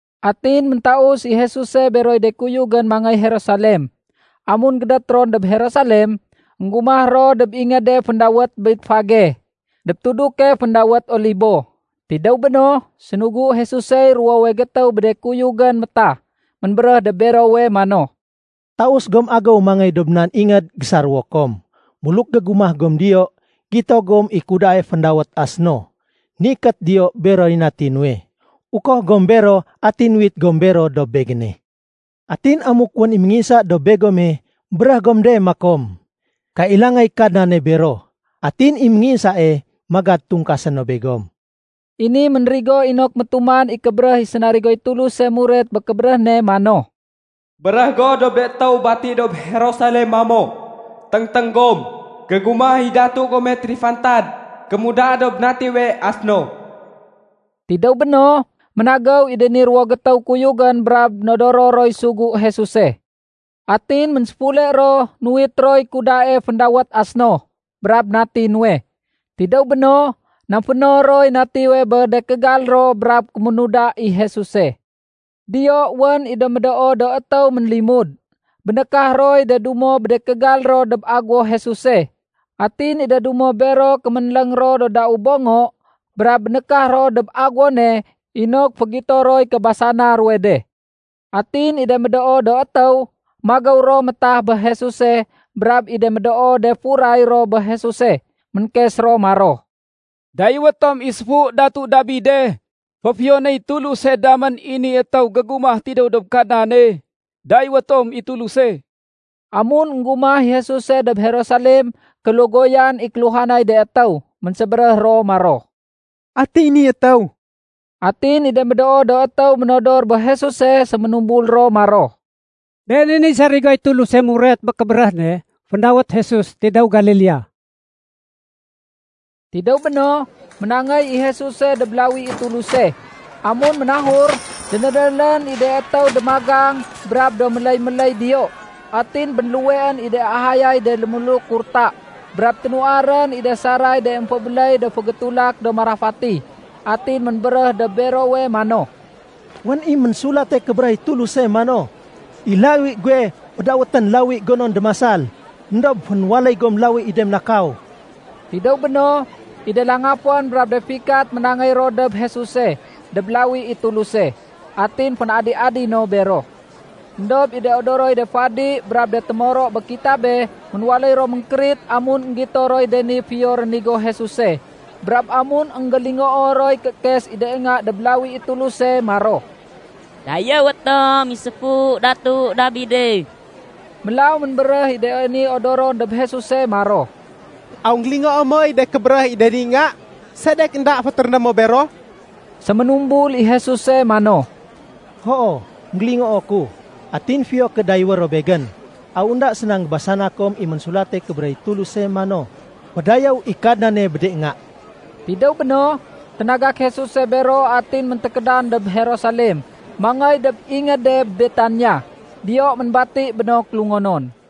Atin méntaus i Jesuse beroy de kuyugén mangéy Jerusalem. Amun gédét ron dob Jerusalem, énggumah ro dob ingéde féndawét Betfage dob tuduke féndawét Olibo. Tidéw béno, sénugu Jesusey ruwowe gétéw bé de kuyugén métah. Ménbéréh dob berowe mano, “Taus gom agéw mangéy dob nan ingéd gésaréwo kom. Buluk gégumah gom diyo, gito gom i kudae féndawét ‘asno’ ménikét diyo beroy nati nuwe. Ukoh gom bero atin uwit gom bero dob Begéne. Atin amuk wén i ménginsa dob begome, béréh gom de makom, ‘Kailangay Kadnane bero.’ Atin i ménginsae magad tungkasé no begom.” I ni ménrigo inok métuman i kébéréh i sénarigoy Tuluse muret bé kébéréh ne mano, “Béréh go dob de étéw bati dob Jerusalem mamo, ‘Téngténg gom, gégumah i datu gome térifantad kémuda dob natiwe asno.’” Tidéw béno, ménagéw i de ni ruwo gétéw kuyugén brab nodoro roy sugu Jesuse. Atin ménséfule ro nuwit roy kudae féndawét asno brab nati nuwe. Tidéw béno, namféno roy natiwe bé de kégal ro brab kéménuda i Jesuse. Diyo wén i de médoo do étéw ménlimud. Bénékah roy de dumo bé de kégal ro dob aguwo Jesuse. Atin i de dumo bero kéménléng ro do dau bongo brab bénékah ro dob agéwone inok fégito roy kébasana ruwe de. Atin i de médoo do étéw magéw ro métah bé Jesuse brab i de médoo de furay ro bé Jesuse, ménkes ro maro, “Dayéwé tom i séfu Datu Dabide! Féfiyonéy Tuluse damén i ni étéw gégumah tidéw dob Kadnane! Dayéwé tom i Tuluse!” Amun énggumah i Jesuse dob Jerusalem, kélogoyan i kéluhanay de étéw. Ménsébéréh ro maro, “Ati ni étéw?” Atin i de médoo do étéw ménodor bé Jesuse séménumbul ro maro, “Been i niy sarigoy Tuluse muret bé kébéréh ne féndawét Jesus tidéw Galilea.” Tidéw béno, ménangéy i Jesuse dob lawi i Tuluse. Amun ménahur, dénédélén i de étéw démagang brab do méléy-méléy diyo. Atin bénluweén i de ahayay de lémuluk kurta brab ténuwarén i de saray de émfébéléy do fégétulak do marafati. Atin ménbéréh dob berowe mano, “Wén i Ménsulate Kébéréh i Tuluse mano, ‘I lawi guwe fédawétén lawi gonon démasal.’ Endob fénwaléy gom lawi i de ménakaw.” Tidéw béno, i de langafén brab de fikat ménangéy ro dob Jesuse dob lawi i Tuluse. Atin fén-adi-adi no bero. Endob i de odoroy de fadi brab de témoro bé kitabé ménwaléy ro ménkérit amun énggito roy de ni fiyo rénigo Jesuse brab amun énggélingoo roy kéékes i de nga dob lawi i Tuluse maro, “Dayéwé tom i séfu Datu Dabide.” Mélaw ménbéréh i de ni odoron dob Jesuse maro, “Aw énggélingoo moy de kébéréh i de ni nga? Sedek énda fétéréné mo bero?” Séménumbul i Jesuse mano, “Hoo, énggélingoo ku. Atin fiyo ké dayéwé ro Begén. Aw énda séna énggébasana kom i Ménsulate Kébéréh i Tuluse mano, ‘Fédayéw i Kadnane bé de nga.’” Tidéw béno, ténagak Jesuse bero atin méntékédan dob Jerusalem mangéy dob ingéde Betania. Diyo ménbati bé no kélungonon.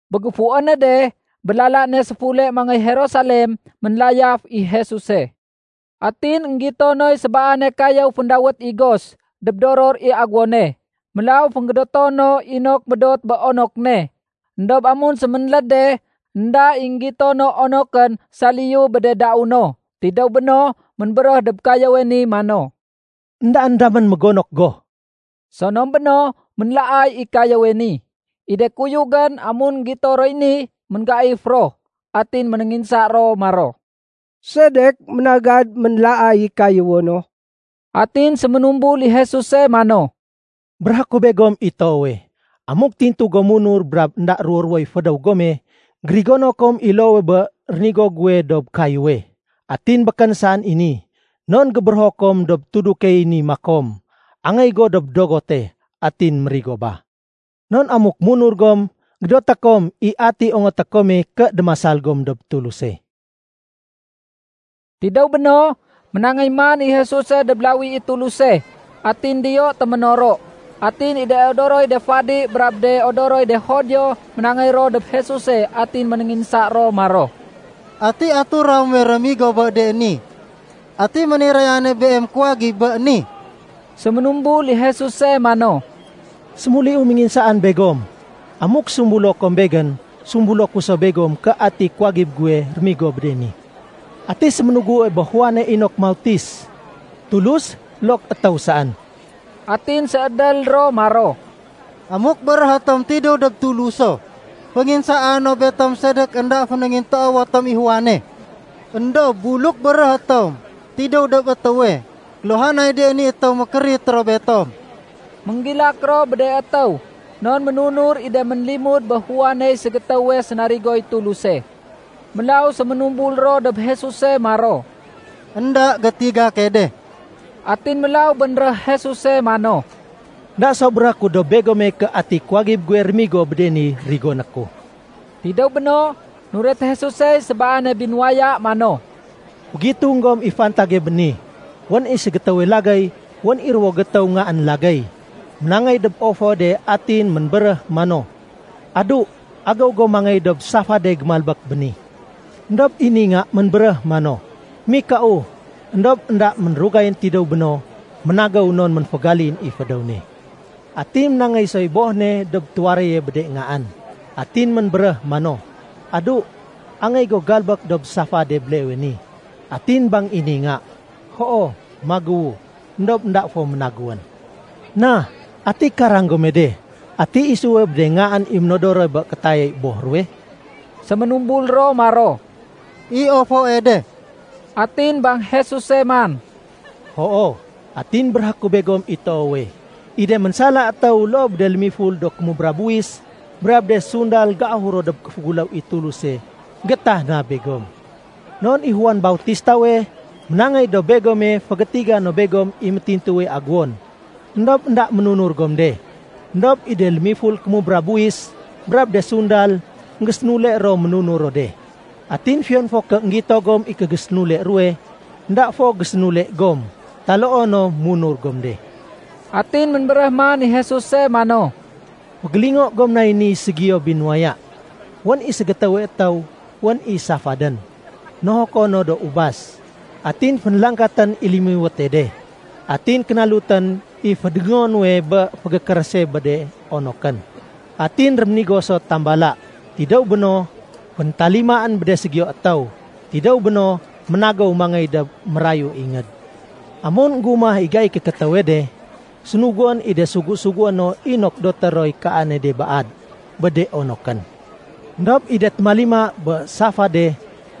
Bé géfuwéne de, bé lala ne séfule mangéy Jerusalem, ménlayaf i Jesuse. Atin énggito noy sébaane kayéw féndawét igos dob doror i aguwone. Mélaw fénggédéto no inok médot bé onok ne. Endob amun séménléd de, énda i énggito no onokén saliyu bé de dau no. Tidéw béno, ménbéréh dob kayéwe ni mano, “Endaén damén mégonok go!” Sonom béno ménlaay i kayéwe ni. I de kuyugén, amun énggito roy ni, ménggaif ro. Atin ménénginsa ro maro, “Sedek ménagad ménlaay i kayéwo no?” Atin séménumbul i Jesuse mano, “Béréhé ku begom i toowe, amuk tintu gom munur brab énda ruwo-ruwoy fédéw gome, gérigono kom i loowe bé rénigo guwe dob kayéwe. Atin békén saén i ni, non gébérého kom dob tudukey ni makom, ‘Angéy go dob dogote’, atin mérigo ba. Non amuk munur gom, gédoté kom i ati ongoté kome ké démasal gom dob Tuluse.” Tidéw béno, ménangéy man i Jesuse dob lawi i Tuluse, atin diyo téménoro. Atin i de odoroy de fadi brab de odoroy de Judio ménangéy ro dob Jesuse atin ménénginsa ro maro, “Ati atura muwe rémigo bé de ni? Ati ménirayane Beem kuwagib bé ni?” Séménumbul i Jesuse mano, “Sémuliu ménginsaan begom. Amuk sumbulo kom Begén, sumbulo ku so begom ké ati kuwagib guwe rémigo bé de ni. Ati séménugue bé Juane inok mautis, Tulus loo ké étéw saén?” Atin séédél ro maro, “Amuk béréh tom ‘Tidéw dob Tuluso’, fénginsaa no betom sedek énda fénéngintoowo tom i Juane. Endob buluk béréhé tom, ‘Tidéw dob étéwe,’ kéluhanay de ni étéw mékérit ro betom.” Ménggilak ro bé de étéw non ménunur i de ménlimud bé Juaney ségétéwe sénarigoy Tuluse. Mélaw séménumbul ro dob Jesuse maro, “Enda gétiga key de.” Atin mélaw bénréh Jesus mano, “Enda so béréhé ku dob begome ké ati kuwagib guwe rémigo bé de ni rigoné ku.” Tidéw béno, nuret Jesusey sébaane binuwaya mano, “Fégitung gom i fantage bé ni. Wén i ségétéwe lagéy wén i ruwo gétéw ngaén lagéy. Ménangéy dob ofoe de atin ménbéréh mano, ‘Adu, agéw go mangéy dob safade gémalbék béni.’ Endob i ni nga ménbéréh mano, ‘Mikau.’ Endob énda mérugayén tidéw béno, ménagéw non ménfégalin i fédéw ne. Atin ménangéy soy boh ne dob tuwaréye bé de ngaén. Atin ménbéréh mano, ‘Adu, angéy go galbék dob safade béleewe ni.’ Atin bang i ni nga, ‘Hoo, magéwu.’ Endob énda fo ménagéwén. Na, ati karang gome de, ati isuwe bé de ngaén i ménodorone bé kétayay boh ruwe?” Séménumbul ro maro, “I ofoe de.” Atin bang Jesuse man, “Hoo, atin béréhé ku begom i toowe, i de ménsala étéw loo bé de lémiful do kémubra buwis brab de sundal géahur dob kéféguléw i Tuluse géétah na begom. Non i Juan Bautistawe ménangéy dob begome fégétiga no begom i métintuwe aguwon, éndob énda ménunur gom de. Endob i de lémiful kémubra buwis brab de sundal énggésénule ro ménunur ro de. Atin fiyon fo ké énggito gom i kégésénule ruwe, énda fo gésénule gom taloo no munur gom de.” Atin ménbéréh man i Jesuse mano, “Fégélingo gom nay ni ségiyo binuwaya. Wén i ségétéwe étéw wén i safadén nohoko no do ubas. Atin fénlangkatén i lémiwéte de, atin kénalutén i fédongo nuwe bé fégékérése bé de onokén. Atin réménigo so tambala. Tidéw béno, féntalimaén bé de ségiyo étéw. Tidéw béno, ménagéw mangéy dob mérayue ingéd. Amun énggumah i gaiy kékétéwe de, sénuguén i de sugu-sugué no inok doté roy kaane de baad bé de onokén. Endob i de témalima bé safade,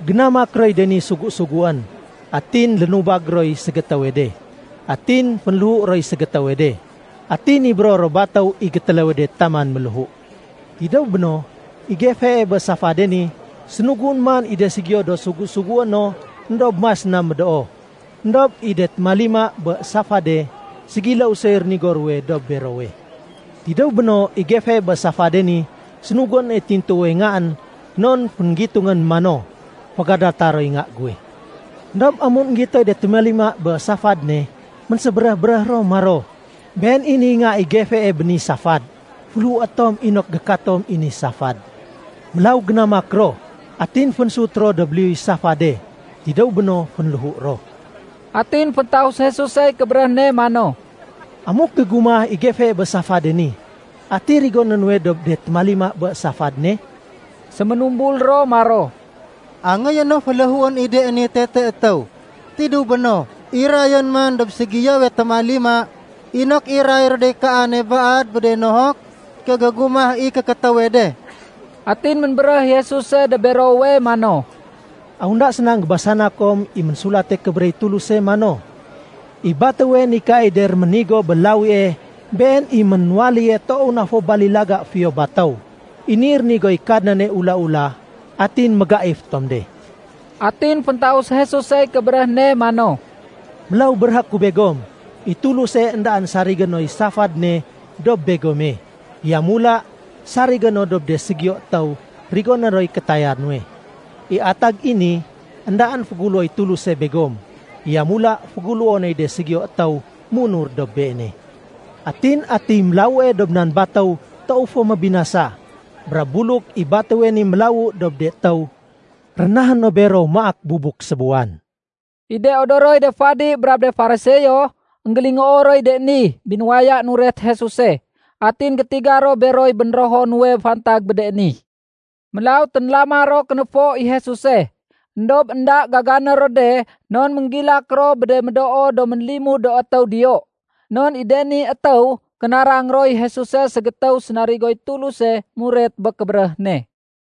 génamak roy de ni sugu-suguén. Atin lénubag roy ségétéwe de, atin fénléhu roy ségétéwe de, atin nibéro ro batéw i gétéléwe de taman ménléhu. Tidéw béno, i gefee bé safade ni, sénuguén man i de ségiyo do sugu-sugué no éndob mas na médoo. Endob i de témalima bé safade, ségiléw soy rénigo ruwe dob berowe. Tidéw béno, i gefee bé safade ni, sénuguén i tintuwe ngaén non fénggitungén mano, ‘Fégadata roy nga guwe.’ Endob amun énggitoy de témalima bé safad ne, ménsébéréh-béréh ro maro, ‘Been i niy nga i gefee bé ni safad. Féléhué tom inok gékatom i ni safad.’ Mélaw génamak ro, atin fénsut ro dob liyuy safade. Tidéw béno, fénléhu ro.” Atin féntaus Jesusey kébéréh ne mano, “Amuk gégumah i gefee bé safade ni, ati rigoné nuwe dob de téménalima bé safad ne?” Séménumbul ro maro, “Angéyé no féléhuén i de ni tete étéw. Tidéw béno, irayén man dob ségiyowe témalima inok iray ro dey kaane baad bé de nohok ké gégumah i kékétéwe de.” Atin ménbéréh i Jesuse dob berowe mano, “Aw énda séna énggébasana kom i Ménsulate Kébéréh i Tuluse mano, ‘I batéwe nikaay de réménigo bé lawie, been i ménwaléye toow na fo balilaga fiyo batéw. I ni rénigoy Kadnane ula-ula, atin mégaif tom de.’” Atin féntaus Jesusey kébéréh ne mano, “Mélaw béréhé ku begom i Tuluse éndaén sarigé noy safad ne dob begome. Yamula sarigé no dob de ségiyo étéw rigoné roy kétaya nuwe. I atag i ni, éndaén féguléwoy Tuluse begom. Yamula féguléwo noy de ségiyo étéw munur dob Beene. Atin atiy mélawue dob nan batéw toow fo mébinasa. Brab buluk i batéwe ni mélawu dob de étéw, rénahé no bero maak bubuk sébuwan.” I de odoroy de fadi brab de Fariseo, énggélingoo roy de ni binuwaya nuret Jesuse. Atin gétiga ro beroy bénrého nuwe fantag bé de ni. Mélaw ténlama ro kénéfo i Jesuse, éndob énda gagané ro de non ménggilak ro bé de médoo do ménlimud do étéw diyo. Non i de ni étéw kénarang roy Jesuse ségétéw sénarigoy Tuluse muret bé kébéréh ne.